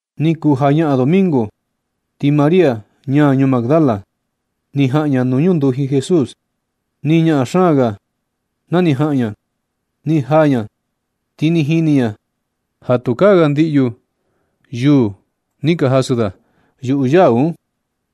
Ni kuu jañaꞌan domingo, ti María, ña ñuu Magdala, ni jaꞌan ña nuu ñunduji Jesús. Nɨ ñaꞌan xaan ga ja ni iin ña ga na ni jaꞌan ña. Ni jaa ña ti ni jini ña ja tukaa ga ndiꞌyu yuu ni ka jasɨ da yuꞌu yau un.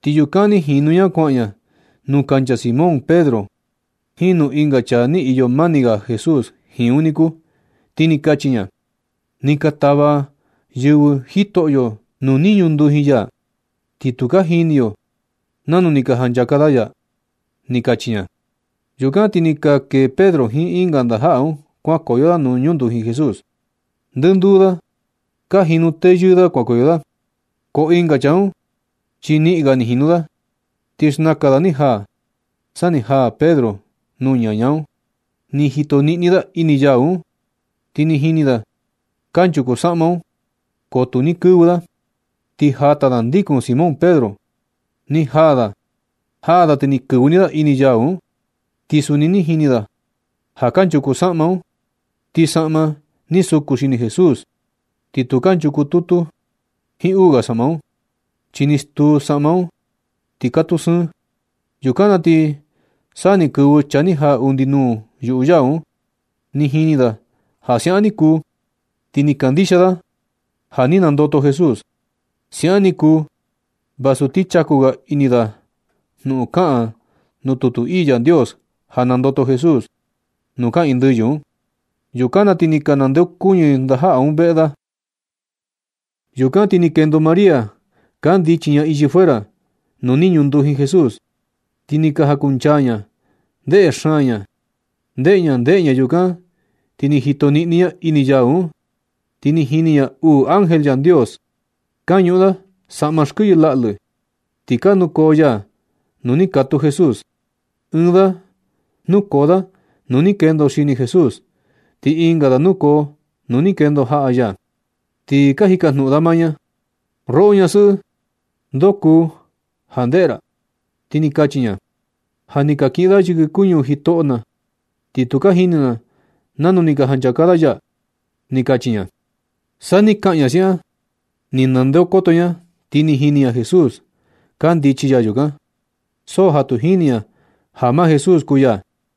Ti yukan ni jinu ña kuaꞌan ña nuu kancha Simón Pedro jiin nuu ɨnga chaa ni iyo mani ga Jesús jiin un niku. Ti ni kachi ña: ―Ni ka tava yɨvɨ Jitoꞌyo nuu ni ñunduji ya, ti tu ka jini yo nanu ni ka janchaka da ya ―ni kachi ña. Yukan ti ni ka kee Pedro jiin ɨnga ndajaꞌa un kuankoyo da nuu ñunduji Jesús. Ndɨnduu da ka jinu tayu da kuankoyo, ko ɨnga chaa un chi niꞌin ga ni jinu da, ti xnakan da ni jaa sa ni jaa Pedro nuu ñaña un. Ni jito niꞌni da ini yau un, ti ni jini da kanchuku saꞌma un, ko tu ni kɨvɨ da. Ti jata da ndikun Simón Pedro ni jaa da, jaa da ti ni kɨvɨ ni da ini yau un. Ti suni ni jini da ja kanchuku saꞌma un. Ti saꞌma ni suku xini Jesús, ti tu kanchuku tutu jiin uu ga saꞌma un, chi ni stuu saꞌma un ti katuu sɨɨn. Yukan na ti sa ni kɨvɨ chaa ni jaa undi nuu yuꞌu yau un. Ni jini da ja siaꞌan ni kuu, ti ni kandixia da ja ni nandoto Jesús. Siaꞌan ni kuu vasu ti chaku ga ini da jnuꞌun kaꞌan nuu tutu ii Yandios, ja nandoto Jesús nuu kaꞌiin ndɨyɨ un. Yukan na ti ni ka nandeokuñɨ ndajaꞌa un veꞌe da. Yukan ti ni kendo María kandichi ña ichi fuera nuu ni ñunduji Jesús, ti ni jakunchaa ña ndeꞌe xaan ña. Ndeꞌe ña ndeꞌe ña, yukan ti ni jito niꞌni ña ini yau un. Ti ni jini ña uu ángel Yandios, ka ñuꞌun da saꞌma kɨyɨ laꞌlɨ, ti ka nukoo ya nuu ni katuu Jesús. Ɨɨn da nukoo da nuu ni kendo xini Jesús, ti ɨnga da nukoo nuu ni kendo jaꞌa ya. Ti ka jikajnuꞌun da maa ña: ―Roꞌo ñasɨꞌɨ, ¿ndo kuu ja ndeꞌe ra? Ti ni kachi ña: ―Ja ni ka kiꞌin da yɨkɨ kuñu jitoꞌo na, ti tu jini na nanu ni ka janchaka da ya ―ni kachi ña. Skan ni kaꞌan ña siaꞌan, ni ndeokoto ña, ti ni jini ña Jesús kandichi ya yukan, so ja tu jini ña ja maa Jesús kuu ya.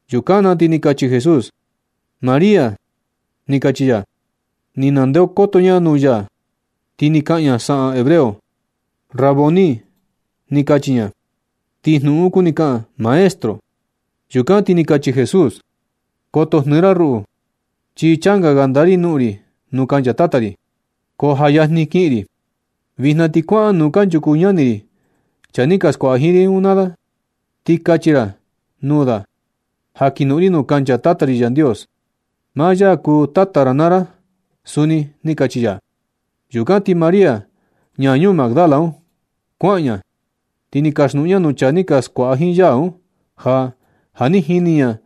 Yukan na ti ni kachi Jesús: ―¡María! ―ni kachi ya. Ni ndeokoto ña nuu ya, ti ni kaꞌan ña saꞌan hebreo: ―¡Raboni! ―ni kachi ña. Ti jnuꞌun un kuni kaꞌan: “Maestro.” Yukan ti ni kachi Jesús: ―Koto jnɨɨ ra ruꞌu, chi changa ga ndaa ri noꞌon ri nuu kancha Tata ri, ko ja yajni kiꞌin ri. Vijna ti kuaꞌan nuu kanchuku ñani ri chaa ni ka skuaꞌa jiin ri un naa da, ti kachi ra nuu da ja kinoꞌon ri nuu kancha Tata ri Yandios. Maa ya kuu Tata ra naa ra suni ―ni kachi ya. Yukan ti María, ñaa ñuu Magdala un, kuaꞌan ña, ti ni kaxnuꞌun ña nuu chaa ni ka skuaꞌa jiin ya un, ja ja ni jini ña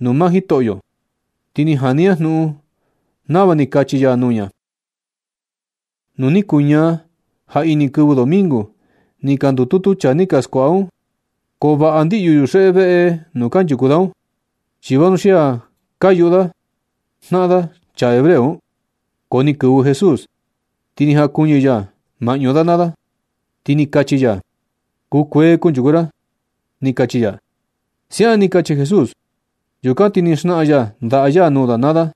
nuu maa Jitoꞌyo. Ti ni jani ña jnuꞌun nava ni kachi ya nuu ña. Nu ni kuñaa jaꞌini kɨvɨ domingo, ni ka ndututu chaa ni ka skuaꞌa un. Ko vaꞌa ndiꞌyu yuxeꞌe veꞌe nuu kanchuku da un, chi vanuxia ka yuꞌu da jnaꞌan da chaa hebreo un. Ko ni kɨvɨ Jesús. Ti ni jankuɨñɨ ya maꞌñu da naa da, ti ni kachi ya: ―Kukuee kanchuku ra ―ni kachi ya. Siaꞌan ni kachi Jesús. Yukan ti ni xnaꞌan ya ndaꞌa ya nuu da naa da.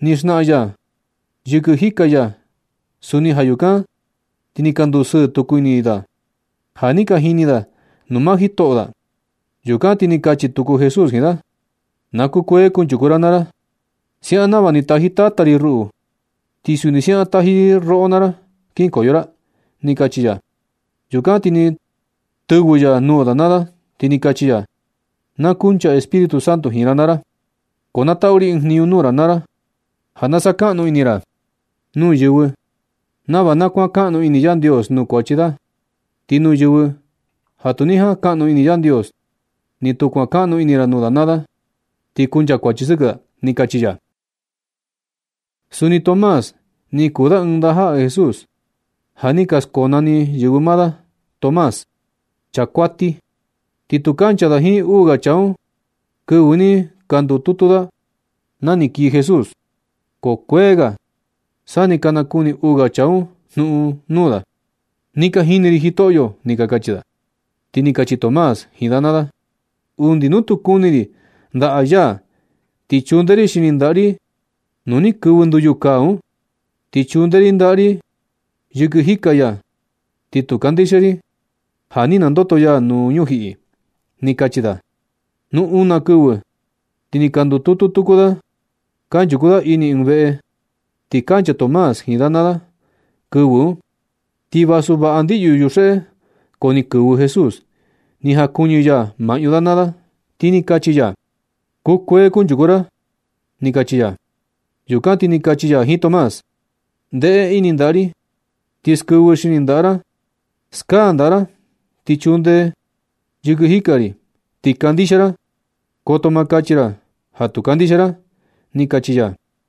Ni xnaꞌan ya yɨkɨ jika ya suni. Ja yukan ti ni ka ndusɨɨ tuku ini da, ja ni ka jini da nuu maa jitoꞌo da. Yukan ti ni kachi tuku Jesús jiin da: ―Na kukuee kunchuku ra naa ra. Siaꞌan nava ni taji Tata ri ruꞌu, ti suni siaꞌan taji ri roꞌo naa ra kinkoyo ra ―ni kachi ya. Yukan ti ni tɨvɨ ya nuu da naa da, ti ni kachi ya: ―Na kunchaa Espíritu Santo jiin ra naa ra. Ko na tatu ri ɨɨn jniñu nuu ra naa ra ja na sakaꞌnu ini ra nuu yɨvɨ nava na kuankaꞌnu ini Yandios nuu kuachi da. Ti nuu yɨvɨ ja tu ni jankaꞌnu ini Yandios, ni tu kuankaꞌnu ini ra nuu da naa da, ti nchakuachi sɨkɨ da ―ni kachi ya. Suni Tomás ni kuu da ɨɨn ndajaꞌa Jesús ja ni ka skonani yɨvɨ maa da (Tomás), chaa kuati. Ti tu kancha da jiin uu ga chaa un kɨvɨ ni ka ndututu da na ni kii Jesús. Ko kuee ga sa ni ka nakani uu ga chaa un jnuꞌun nuu da: ―Ni ka jini ri Jitoꞌyo ―ni ka kachi da. Ti ni kachi Tomás jiin da naa da: ―Undi nu tu kuni ri ndaꞌa ya, ti chunde ri xini ndaꞌa ri nuu ni kɨvɨ nduyu kaa un, ti chunde ri ndaꞌa ri yɨkɨ jika ya, ti tu kandixia ri ja ni nandoto ya nuu ñujiꞌi ―ni kachi da. Nu una kɨvɨ ti ni ka ndututu tuku da, kanchuku da ini ɨɨn veꞌe, ti kancha Tomás jiin da naa da kɨvɨ un. Ti vasu vaꞌa ndiꞌyu yuxeꞌe, ko ni kɨvɨ Jesús, ni jankuɨñɨ ya maꞌñu da naa da, ti ni kachi ya: ―Kukuee kanchuku ra nu ―ni kachi ya. Yukan ti ni kachi ya jiin Tomás: ―Ndeꞌe ini ndaꞌa ri ti skɨvɨ xini ndaꞌa ra. Skaa ndaꞌa ra ti chunde yɨkɨ jika ri, ti kandixia. Koto ma kachi ra ja tu kandixia ra ―ni kachi ya.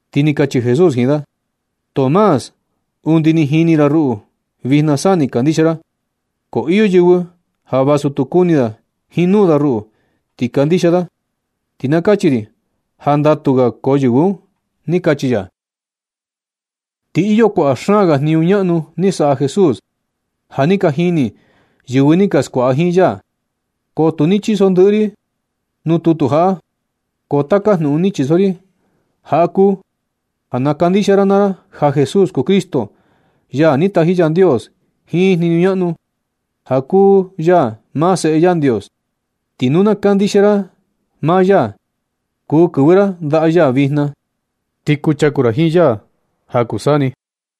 Ti ni kachi Jesús jiin da: ―Tomás, undi ni jini ra ruꞌu, vijna sa ni kandixia ra. Ko iyo yɨvɨ ja vasu tu kuni da jiin nuu da ruꞌu, ti kandixia da. Ti na kachi ri ja ndatu ga koo yɨvɨ un ―ni kachi ya. Ti iyo kuaꞌa xaan ga jniñu ñaꞌnu ni saꞌa Jesús ja ni ka jini yɨvɨ ni ka skuaꞌa jiin ya. Ko tu ni chiso ndɨꞌɨ ri un nuu tutu jaꞌa. Ko taka jnuꞌun ni chiso ri jaꞌa kuu ja na kandixia ra naa ra ja Jesús kuu Cristo, ya ni taji Yandios jiin jniñu ñaꞌnu, ja kuu ya maa Seꞌe Yandios. Ti nu na kandixia ra maa ya, kuu kɨvɨ ra ndaꞌa ya vijna, ti kuchaku ra jiin ya ja kuu saa ni.